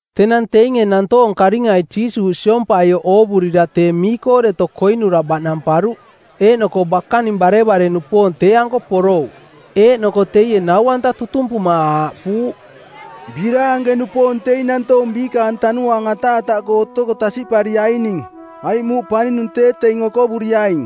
Tenang teinge nantoong karingai Jiisuuꞌ siompaioꞌ oovurira tee mii-koo deto koinura baꞌnamparuꞌ. Eeꞌnoko bakaning barevare-nupoong tee-anko porouꞌ. Eeꞌnoko teie nau-anta tutumpuma aaꞌpuuꞌ, “Biraanke-nupoong teing nantoong biikaang tanuaang ataataꞌkoo otoko tasiꞌpariaining, aiꞌ muuꞌ paninung tee teing okovoroaing.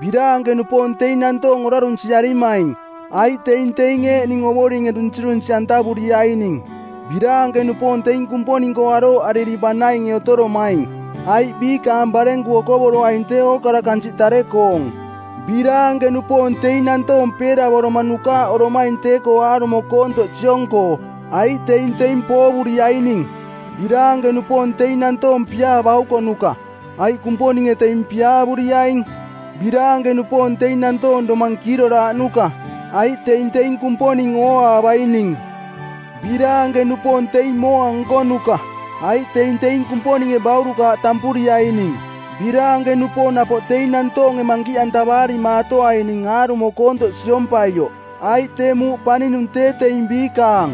Biraanke-nupoong teing nantoong orarunsiarimaing, aiꞌ teing teing eeꞌning Ovoringe dunsirunsi˜antavuriaining. Biraanke-nupoong teing Kumponing-koo arooꞌariri banainge otoromaing, aiꞌ biikaang barenku okovoroaing tee ookara kansiꞌ tare-koong. Biraanke-nupoong teing nantoong peeravoroma nukaaꞌoromaing tee-koo aarumo koontoꞌ siong-koo, aiꞌ teing teing poovuriaining. Biraanke-nupoong teing nantoong piaa-baukonuka, aiꞌ Kumponinge teing piaavuriaing. Biraanke-nupoong teing nantoong domang kiiroraaꞌnuka, aiꞌ teing teing Kumponing ooaavaining. Biraanke-nupoong teing mooa nkonuka, aiꞌ teing teing Kumponinge baurukaaꞌ tampuriaining. Biraanke-nupoong napoꞌ teing nantoonge mankiꞌantavaarimaatoaining aarumo koontoꞌ siompaioꞌ, aiꞌ tee Muuꞌ Paninung tee teing biikaang.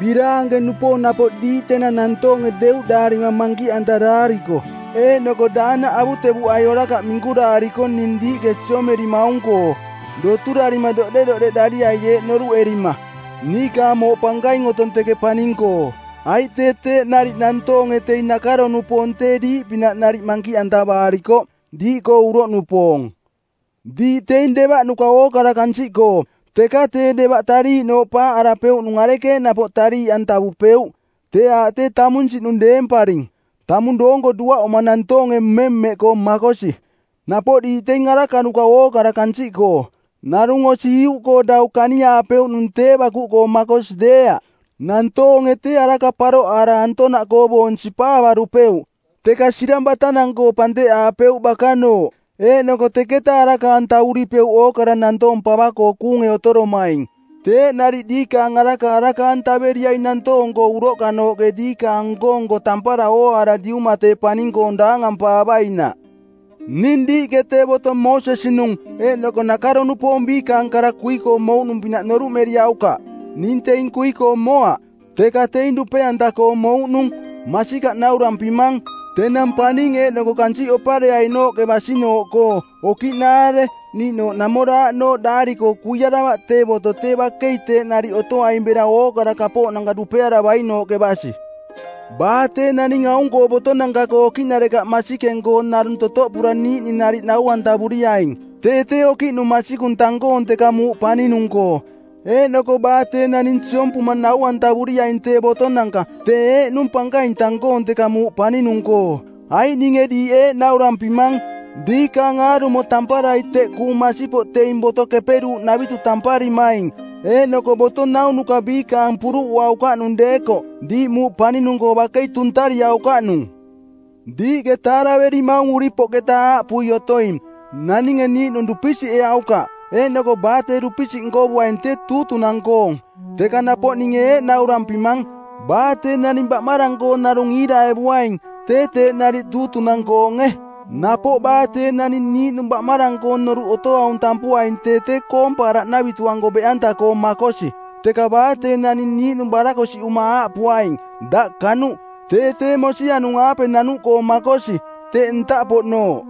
Biraanke-nupoong napoꞌ diiꞌ tenang nantoonge deuꞌdaarima mankiꞌantaraariko eeꞌnoko daanaꞌ avutevuꞌai orakaꞌ minkuraariko ning diiꞌke siomerimaung-koo. Doturarima doꞌderoꞌdeꞌdariai eeꞌ noruꞌerima, ‘Niikaang mooꞌ pankaing otong teke paning-koo.’ Aiꞌ tee teeꞌ nariꞌ nantoonge teing nakaro-nupoong tee diiꞌpinaꞌ nariꞌ mankiꞌantavaarikoꞌ, diiꞌkoo uroꞌnupoong.” “Diiꞌ teing devaꞌnuka ookara kansiꞌkoo, teka tee devaꞌ tariiꞌnooꞌ paaꞌarapeuꞌnung arekeeꞌ napoꞌ tariiꞌantavupeuꞌ? Tee aaꞌ tee tamunsiꞌnung deemparing. Tamung doonko duaꞌuma nantoonge mmemmeꞌkoo makosi. Napoꞌ diiꞌ teing arakanuka ookara kansiꞌkoo. Narung osi iuꞌkoo dau kaniaapeuꞌnung tee bakuꞌkoo makosi deeaꞌ. Nantoonge tee araka paroꞌaara antonaꞌkoo boong sipaavarupeuꞌ, teka sirang batanang-koo panteꞌaapeuꞌ bakanooꞌ, eeꞌnoko teketa araka-antavuripeuꞌ ookara nantoong pava-koo kuunge otoromaing. Teeꞌ nariꞌ diikaang araka araka-antaveriaing nantoong-koo uroꞌkanooꞌke diikaang nko-nko tampara ooaara Diuma tee paning-koong daangampaavainaꞌ.” “Ning diiꞌke tee boto Moosesi-nung eeꞌnoko nakaro-nupoong biikaang kara kui-koo mouꞌnung-pinaꞌ noruꞌmeriaukaꞌ. Ning teing kui-koo moaꞌ, teka teing dupe-anta-koo mouꞌnung. Masikaꞌ naurampimang, tenang paning eeꞌnoko kansiꞌ opareainooꞌke basinooꞌkoo okiꞌnaare niiꞌnooꞌ namooraꞌnooꞌ daari-koo kuiaravaꞌ tee boto tee bakei teeꞌ nariꞌ otoaing bera ookara kapooꞌnanka dupearavainooꞌke basi. Baa tee naning aung-koo botonanka-koo okiꞌnarekaꞌ masikeng-koo narung totoꞌpura niiꞌning nariꞌ nau-antavuriaing tee tee okiꞌnung masikung tang-koong teka muuꞌ paninung-koo. Eeꞌnoko baa tee naning siompuma nau-antavuriaing tee botonanka tee eeꞌnung pankaing tang-koong teka muuꞌ paninung-koo. Aiꞌ ninge diiꞌ eeꞌ naurampimang, diikaang aarumo tamparai teꞌ kuung masipoꞌ teing boto keperuuꞌnavitu tamparimaing eeꞌnoko boto naunuka biikaang puruꞌuaukaꞌnung deekoꞌ diiꞌ muuꞌ paninung-koo bakei tuntariaukaꞌnung.” “Diiꞌke taaraverimaung uripoꞌketa aaꞌpui otoing, ‘Naninge niiꞌnung dupisiꞌeaukaꞌ, eeꞌnoko baa tee dupisiꞌ nkovuaing tee tuutunang˜koong.’ Teka napoꞌ ninge eeꞌ naurampimang, baa tee naning baꞌmarang-koo narung iiraevuaing tee teeꞌ nariꞌ tuutunang-koonge. Napoꞌ baa tee naning niiꞌnung baꞌmarang-koong noruꞌ otoaung tampuaing tee tee koompaaraꞌnavitu-anko beꞌanta-koo makosi. Teka baa tee naning niiꞌnung barakosiꞌuma aaꞌpuaing, ‘Daꞌ kanuꞌ!’ tee tee mosianung-aape nanuꞌkoo makosi, teꞌ ntaꞌpoꞌnooꞌ.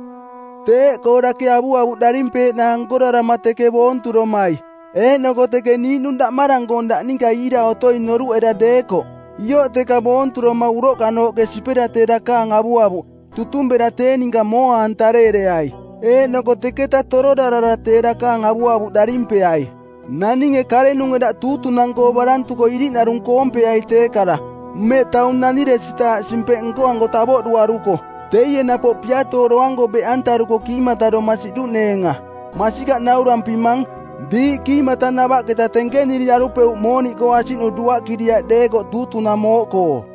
Teeꞌkoo dake avuavuꞌ darimpeeꞌnaang nkorarama teke boonturomai eeꞌnoko teke niiꞌnung daꞌmarang-koong daꞌ ninka iira otoing noruꞌera deekoꞌ, ioꞌ teka boonturoma uroꞌkanooꞌke sipera tee dakaang avuavuꞌ, tutung bera tee ninka mooa-antareereai, eeꞌnoko teketa tororarara tee dakaang avuavuꞌ darimpeai. “Naninge karenunge daꞌ tuutunang-koo barantuko iriꞌnarung koompeai tee kara, mmeꞌ taung naniresitaaꞌ simpeꞌnko˜anko tavoꞌduaruko. Teie napoꞌ piatooro˜anko beꞌantaruko kiimataroma siꞌduꞌneenga. Masikaꞌ naurampimang, diiꞌ kiimatanavaꞌketa tenkeniriarupeuꞌ mooniꞌkoo asiꞌnu duaꞌkiriaꞌ deekoꞌ tuutunang mooꞌkoo.”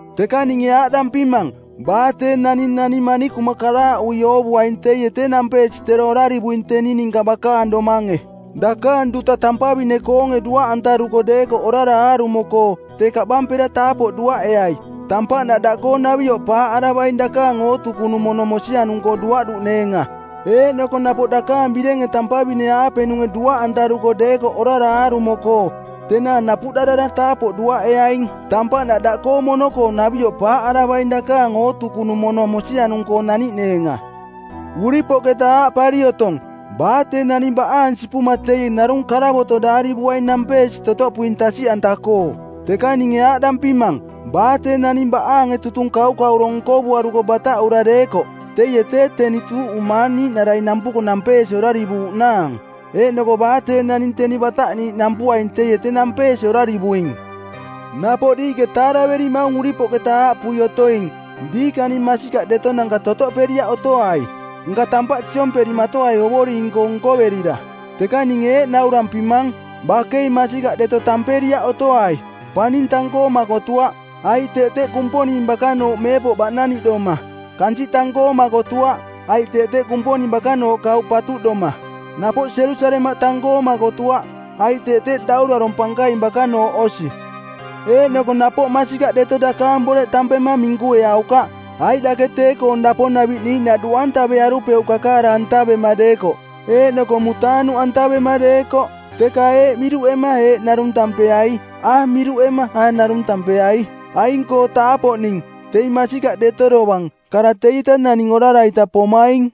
Teka ninge aaꞌdampimang, baa tee naning nani manikuma karaaꞌui oovuaing teie tee nampeesi tero orarivuing teni ninka bakaang domange. Dakaang duta tampavine-koonge duaꞌantaruko deekoꞌ orara aarumo-koo tee kaꞌbampera taapoꞌ duaꞌeai. Tampaꞌnaꞌ daꞌkoo navioꞌ paaꞌaravaing dakaang ootukunung mono mosianung-koo duaꞌduꞌneenga. Eeꞌnoko napoꞌ dakaang birenge tampavine-aapenunge duaꞌantaruko deekoꞌ orara aarumo-koo, tenaang napuꞌdarara taapoꞌ duaꞌeaing. Tampaꞌnaꞌ daꞌkoo mono-koo navioꞌ paaꞌaravaing dakaang ootukunung mono mosianung-koo naniꞌneenga. “Uripoꞌketa aaꞌpari otong, ‘Baa tee naning baꞌaang sipuma teie narung karavoto˜ daarivuaing nampeesi totoꞌpuing tasiꞌanta-koo.’ Teka ninge aaꞌdampimang, baa tee naning baꞌaange tutung kaukauro nkovuaruko bataꞌura deekoꞌ teie tee teni tuuꞌumaang niiꞌnarai nampuko nampeesi orarivuuꞌnaang. Eeꞌnoko baa tee naning teni bataꞌniiꞌ nampuaing teie tee nampeesi orarivuing.” “Napoꞌ diiꞌke taaraverimaung uripoꞌketa aaꞌpui otoing, ‘Diikaning masikaꞌdetonanka totoꞌperiaꞌ otoai, nka tampaꞌ siomperimatoai Ovoring-koo nkoverira.’ Teka ninge eeꞌ naurampimang, bakei masikaꞌ deto tamperiaꞌ otoai. Paning tang-koo makotuaꞌ, aiꞌ teꞌ teꞌ Kumponing bakanooꞌ meepoꞌ baꞌnaniꞌdoma. Kansiꞌ tang-koo makotuaꞌ, aiꞌ teꞌ teꞌ Kumponing bakanooꞌ kauꞌ patuꞌdoma. Napoꞌ Jerusalemaꞌ tang-koo makotuaꞌ, aiꞌ teꞌ teꞌ Daurarong˜ Pankaing bakanooꞌ osi. Eeꞌnoko napoꞌ masikaꞌ deto dakaang boreꞌ tampema minkueaukaꞌ, aiꞌ dake tee-koong daponaviꞌ niiꞌnaꞌ duꞌantavearupeuꞌ kakaara-antavema deekoꞌ eeꞌnoko mutaanuꞌantavema deekoꞌ. Teka ‘Eeꞌ’ miruꞌema ‘Eeꞌ’ narung tampeai. ‘A’ miruꞌema, ‘A’ narung tampeai. Aing-koo taapoꞌning, teing masikaꞌ deto dovang, kara teieta naning orara-ita pomaing.”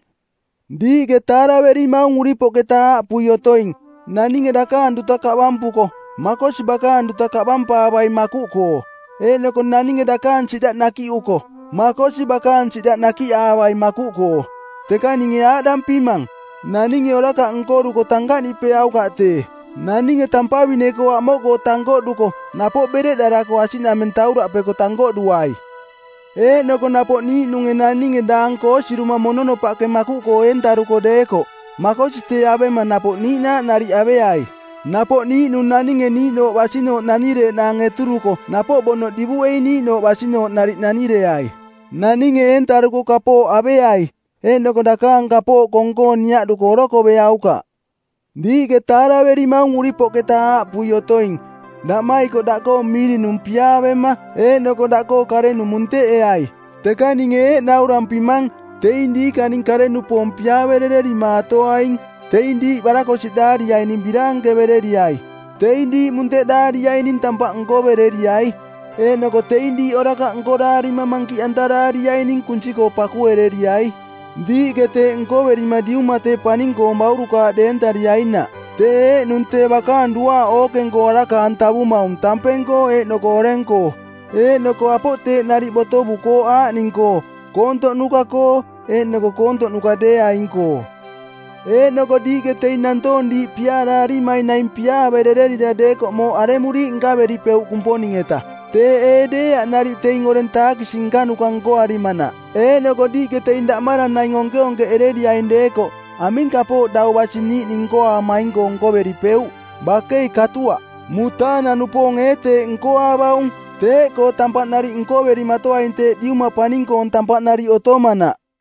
“Diiꞌke taaraverimaung uripoꞌketa aaꞌpui otoing, ‘Naninge dakaang duta kaꞌbampuko, makosi bakaang duta kaꞌbampaavaing makuꞌkoo,’ eeꞌnoko ‘Naninge dakaang siꞌdaꞌ nakiꞌuko, makosi bakaang siꞌdaꞌ nakiꞌaavai makuꞌkoo.’ Teka ninge aaꞌdampimang, naninge orakaꞌ nkoruko tankaꞌniꞌpeaukaꞌ tee. Naninge tampavine-koo amoꞌkoo tankoꞌduko napoꞌ bereꞌdarako asiꞌnameng tauraꞌpeko tankoꞌduai. Eeꞌnoko napoꞌ niiꞌnunge naninge daang koosiruma mononopaꞌke makuꞌkoo eentavarako deekoꞌ, makosi tee avema napoꞌ niiꞌnaaꞌ nariꞌ aveai. Napoꞌ niiꞌnung naninge niiꞌnooꞌ basinooꞌ nanireeꞌnaang eturuko napoꞌ bonoꞌ divuꞌei niiꞌnooꞌ basinooꞌ nariꞌ nanireai. Naninge eentaruko kapooꞌ aveai eeꞌnoko dakaang kapooꞌ kong-koo niaꞌduko orokoveaukaꞌ.” “Diiꞌke taaraverimaung uripoꞌketa aaꞌpui otoing, ‘Daꞌmaikoꞌ daꞌkoo miirinung piaavema eeꞌnoko daꞌkoo karenung munteꞌeai.’ Teka ninge eeꞌ naurampimang, teing diikaning kare-nupoong piaaverererimaatoaing. Teing diiꞌ barakosiꞌdaariaining biraankevereriai. Teing diiꞌ munteꞌdaariaining tampaꞌ nkovereriai. Eeꞌnoko teing diiꞌ orakaꞌ nkoraarima mankiꞌantaraariaining kunsi-koo pakuereriai. Diiꞌke teeꞌ nkoverima Diuma tee paning-koong baurukaaꞌ deentariainaꞌ. Tee eeꞌnung tee bakaang duaaꞌ ookeng-koo araka-antavumaung tampeng-koo eeꞌnoko oreng-koo, eeꞌnoko apoꞌ teeꞌ nariꞌ botovukooꞌ aaꞌning-koo koontoꞌnuka-koo eeꞌnoko koontoꞌnuka deeaing-koo. Eeꞌnoko diiꞌke teing nantoong diiꞌ piaaraarimaing naing piaaverererira deekoꞌ mooꞌ aremuriiꞌ nkaveripeuꞌ Kumponing-eta? Teeꞌ ee deeaꞌ nariꞌ teing oreng taakisi nkanuka nkoarimanaꞌ? Eeꞌnoko diiꞌke teing daꞌmarang naing onkeonkeꞌereriaing deekoꞌ aming kapooꞌ dau basi niiꞌning nkoaamaing-koo nkoveripeuꞌ? Bakei katuaꞌ. Mutaanang-nupoonge ee teeꞌ nkoaavaung? Teeꞌkoo tampaꞌ nariꞌ nkoverimatoaing teeꞌ Diuma paning-koong tampaꞌ nariꞌ otomanaꞌ.”